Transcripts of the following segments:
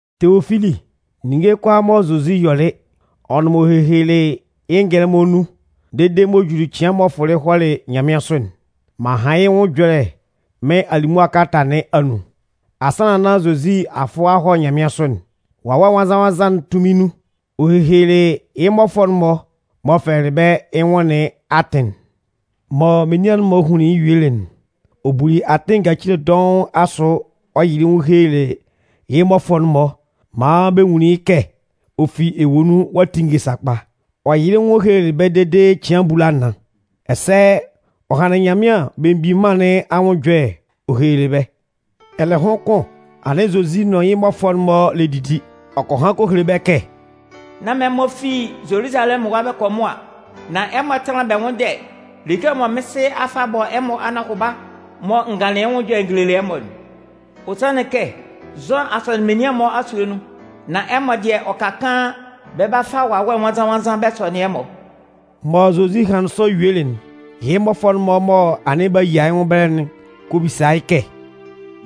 Teofili, Ninnge kʋalaa mɔ Zozi yɔlɩ, ɔ nʋn m'ɔ hehelelɩ yɩ́ ngɛlɛmɔ nun dede m'ɔ juli cɩan m'ɔ fʋlɩ hɔlɩ nyanmɩansʋ'n, m'an han yɩ́ nwʋn ɛjɔlɛ mɩ́n alimʋa kalata nɩn anun. Asannan nán Zozi a fʋ a hɔ nyanmɩansʋ'n, Wawɛ Nwannzan-nwannzan'n tunmin nun, ɔ hehelelɩ yɩ́ mmɔfʋɛ'n-mɔ m'ɔ fɛlɛlɩ bɛ́ yɩ́ nwʋn nɩn atɩn'n. Mɔ menian'n-mɔ hunlin yɩ́ yuelɩ'n, ɔ buli atɩn ngacile dɔʋn asʋ ɔ yɩlɩ yɩ́ nwʋn ɔ helelɩ yɩ́ mmɔfʋɛ'n-mɔ maan bɛ nwunlin yɩ́ kɛ ɔ fi ewue nun ɔ'a tinnge sakpa. Ɔ yɩlɩ yɩ́ nwʋn ɔ helelɩ bɛ́ dede cɩan abulanan, ɛsɛ ɔ hanlɩn Nyanmɩan Belemgbin Mân nɩn anwʋn ɛjɔlɛ ɔ helelɩ bɛ́. Ɛlɛhʋn kʋn, anɩn Zozi nʋn yɩ́ mmɔfʋɛ'n-mɔ lɛ didi, ɔ kɔ han kɔ hele bɛ́ kɛ: “Nán man ɛmɔ fi Zoluzalɛmʋn ɛwa bɛ kɔ mʋa. Nan ɛmɔ tánlan bɛ nwʋ́nndɛ like'n mɔ Sɩɛ nɩn a fa a bɔ ɛmɔ anɔhʋba mɔ n ganlɩn yɩ́ nwʋn ɛjɔlɛ n gelelɩ ɛmɔ'n. Ɔ sanlɩn kɛ, Zʋan a sɔnɩn menian'n-mɔ asue nun, nan ɛmɔ dɩɛ, ɔ ka kaan, bɛ 'ba fa Wawɛ Nwannzan-nwannzan bɛ sɔnɩn ɛmɔ.” Mɔ Zozi hanlɩn sɔ yuelɩ'n, yɩ́ mmɔfʋɛ'n-mɔ mɔ anɩn b'a yia yɩ́ nwʋn ɛbɛlɛ'n kɔ bisa yɩ́ kɛ: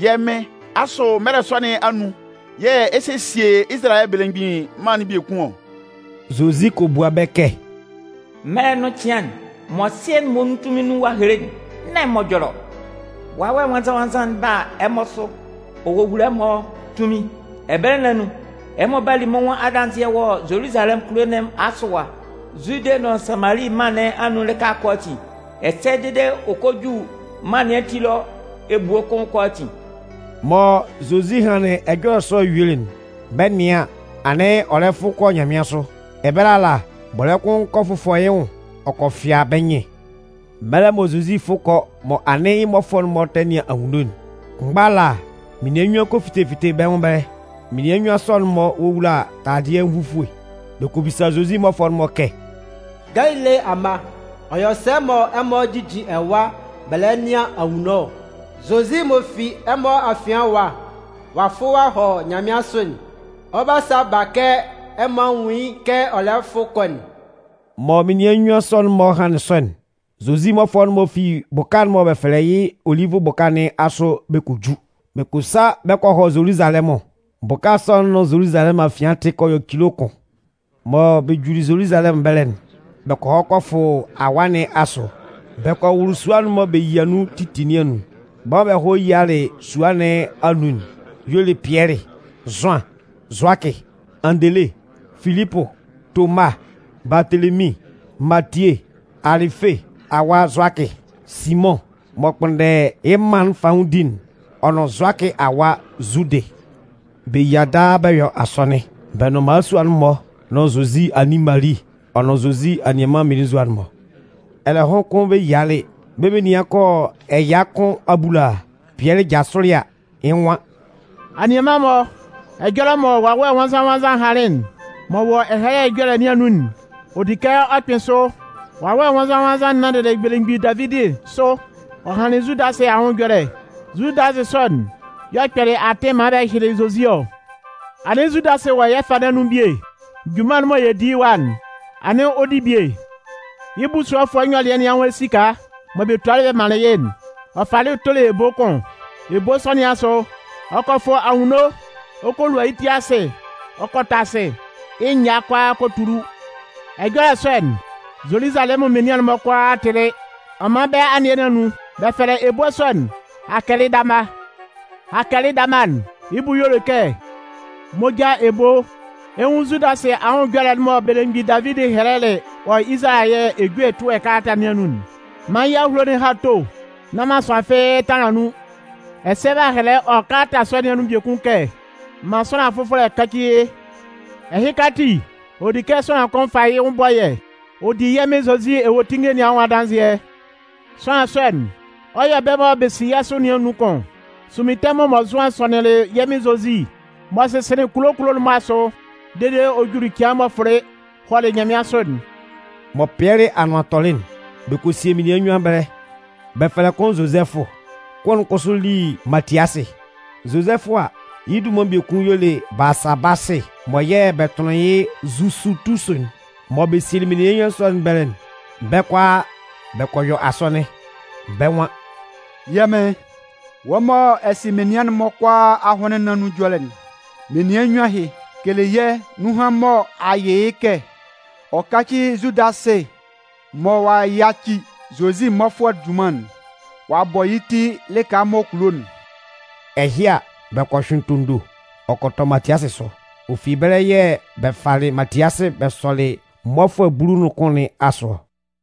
“Yɛ́ Mɩn, asʋ mɛlɛ sɔ nɩn anun yɛ̂ ɛ 'sesie Izalayɛ belemgbin mân'n biekun ɔ?” Zozi kɔ bua bɛ́ kɛ: “Mɛlɛ'n nʋn cɩan'n mɔ Sɩɛ'n muonun tunmin nun ɔ'a hele'n, nán ɛmɔ ɛjɔlɛ ɔ. Nan Wawɛ Nwannzan-nwannzan'n 'ba a ɛmɔ sʋ ɔ wowula ɛmɔ tunmin. Ɛbɛlɛ nɩn anun, ɛmɔ 'ba li mɩ́n nwʋn adanzɩɛ wɔ Zoluzalɛmʋn kulo nɩn asʋ ɛwa, Zude nʋn Samali mân nɩn anun lɩka kʋalaatin, ɛsɛ dede ɔ kɔ ju mân nɩn ati ɛlɔ ebue kʋn kʋalaatin.” Mɔ Zozi hanlɩn ɛjɔlɛ sɔ'n yuelɩ'n, bɛ 'nɩan an, anɩn ɔ lɛ fʋ kɔ nyanmɩansʋ. Ɛbɛlɛ ala, bɔlɛ́ kʋn kɔ fʋfɔ yɩ́ nwʋn ɔ kɔ fɩa bɛ́ nyɩn. Mɛlɛ mɔ Zozi 'fʋ kɔ mɔ anɩn yɩ́ mmɔfʋɛ'n-mɔ tɛ nɩan anwunno'n, kʋnmgba ala menian nnyuan kɔ fite fite bɛ́ nwʋn ɛbɛlɛ. Menian nnyuan sɔ'n-mɔ wowula taladɩɛ nvufue. Bɛ kɔ bisa Zozi mmɔfʋɛ'n-mɔ kɛ: “Galile amma, ɔ yɔ sɛ mɔ ɛmɔ jijin ɛwa bɛ lɛ nɩan anwunno ɔ? Zozi m'ɔ fi ɛmɔ afian ɛwa ɔ'a fʋ ɔ'a hɔ nyanmɩansʋ'n, ɔ 'ba sa ba kɛ ɛmɔ a nwun yɩ́ kɛ ɔ lɛ fʋ kɔ'n.” Mɔ menian nnyuan sɔ'n-mɔ hanlɩn sɔ'n, Zozi mmɔfʋɛ'n-mɔ fi bʋka'n mɔ bɛ fɛlɛ yɩ́ “Olivʋ bʋka” nɩn asʋ bɛ kɔ ju. Bɛ kɔ sa bɛ kɔ hɔ Zoluzalɛmʋn. Bʋka sɔ'n nʋn Zoluzalɛmʋn afian tɩ kɔ yɔ cilo kʋn. Mɔ bɛ juli Zoluzalɛmʋn ɛbɛlɛ'n, bɛ kɔ hɔ kɔ fʋ awaa nɩn asʋ, bɛ kɔ wʋlʋ sua'n mɔ bɛ yia nun titi nɩn anun. Bɛ́ mɔ bɛ hɔlɩ yialɩ sua nɩn anun'n y'ɔ le Pɩɛlɩ, Zʋan, Zʋakɩ, Andele, Filipʋ, Toma, Baatelemin, Matie, Alɩfe awa Zʋakɩ, Simʋn m'ɔ kpʋnndɛ yɩ́ mân'n fanwʋndi'n ɔ nʋn Zʋakɩ awa Zudɩ. Bɛ yia daa bɛ yɔ asɔnɩn, bɛ nʋn mmalasua'n-mɔ nʋn Zozi anin Mali ɔ nʋn Zozi anianman mmelenzua'n-mɔ. Ɛlɛhʋn kʋn bɛ yialɩ, bɛ́ menian kɔ yɔ ɛya kʋn abulaa, Pɩɛlɩ jasʋlɩ a, yɩ́ nwan: “Anianman-mɔ, ɛjɔlɛ mɔ Wawɛ Nwannzan-nwannzan'n hanlɩn m'ɔ wɔ Ɛhɛlɛ Ɛjɔlɛ nɩn anun'n, ɔ di kɛ ɔ kpɩ́n sʋ. Wawɛ Nwannzan-nwannzan'n nanndɩlɩ belemgbin Davidi sʋ ɔ hanlɩn Zudasɩ anwʋn ɛjɔlɛ. Zudasɩ sɔ'n y'ɔ kpɛlɩ atɩn maan bɛ hyɩlɩ Zozi ɔ. Anɩn Zudasɩ wɔ yɛ́ fâ nɩn anun bie. Junman'n mɔ yɛ lɛ di yɩ́ ɛwa'n, anɩn ɔ di bie. Yɩ́ busuɔfʋɛ nyɔlɩɛ nɩn anwʋn esika mɔ bɛ tualɩ bɛ manlɩn yɩ́'n, ɔ falɩ tolɩ ebo kʋn. Ebo sɔ nɩn asʋ, ɔ kɔ fʋ anwunno ɔ kɔ lua yɩ́ ti asɩ ɔ kɔ tɔ asɩ, yɩ́ nyaa kʋalaa kɔ tulu. Ɛjɔlɛ sɔ'n, Zoluzalɛmʋn menian'n-mɔ kʋalaa tɩlɩ. Ɔ man bɛ́ anɩɛ nɩn anun, b'a fɛlɛ ebo sɔ'n ‘Hakɛlɩdama’. Hakɛlɩdama'n, yɩ́ bʋ y'ɔ le kɛ: ‘moja ebo’. “Ɛ 'nwun Zudasɩ anwʋn ɛjɔlɛ'n mɔ belemgbin Davidi hɛlɛlɩ wɔ Izalayɛ ejue ɛtʋɛ kalata nɩn anun'n: Man yɩ́ awulo'n há to, nán man sʋanlan fɩ́ɩ́ tanlan nun. Ɛsɛ b'a hɛlɛ wɔ kalata sɔ nɩn anun biekun kɛ: Man sʋanlan fʋfɔlɛ káci yɩ́. “Ɛhɩka ati, ɔ di kɛ sʋanlan kʋn fa yɩ́ nwʋn bɔ yɛ́ ɔ di yɛ́ Mɩn Zozi ewuetinnge nɩn anwʋn adanzɩɛ. Sʋanlan sɔ'n, ɔ yɔ́ bɛ́ mɔ bɛ si yɛ́ sʋ nɩn anun kʋn, sunmin tɛmʋn mɔ Zʋan sɔnɩnlɩn yɛ́ Mɩn Zozi, m'ɔ sɩsɩnlɩn kulo kulo'n-mɔ asʋ, dede ɔ juli cɩan m'ɔ fʋlɩ hɔlɩ nyanmɩansʋ'n.” Mɔ Pɩɛlɩ anʋan tɔlɩ'n, bɛ kɔ sie menian nnyuan ɛbɛlɛ. Bɛ fɛlɛ kʋn Zozɛfʋ. Kʋn'n kʋsʋ li Matiasɩ. Zozɛfʋ a, yɩ́ dunman biekun y'ɔ le Baasabasɩ mɔ yɛ̂ bɛ tʋnlɩn yɩ́ Zusutusu'n. Mɔ bɛ sielɩ menian nnyuan sɔ nɩn ɛbɛlɛ'n, bɛ́ kʋalaa bɛ kɔ yɔ asɔnɩn. Bɛ́ nwan: “Yɛ́ Mɩn, wɔ́ mɔ ɛ sɩ menian'n-mɔ kʋalaa ahʋnlɩn nɩn anun ɛjɔlɛ'n, menian nnyuan ɛhɩ, kele yɛ́ nunhan'n mɔ a yɩ yɩ́ kɛ ɔ káci Zudasɩ mɔ ɔ'a yaci Zozi mmɔfʋɛ junman'n ɔ'a bɔ yɩ́ ti yɩ́ lɩka m'ɔ kulo'n.” Ɛhɩ a, bɛ kɔ hyʋɩn tondo, ɔ kɔ tɔ Matiasɩ sʋ. Ɔ fi ɛbɛlɛ yɛ̂ bɛ falɩ Matiasɩ bɛ sɔlɩ mmɔfʋɛ bulu nʋn kʋn nɩn asʋ ɔ.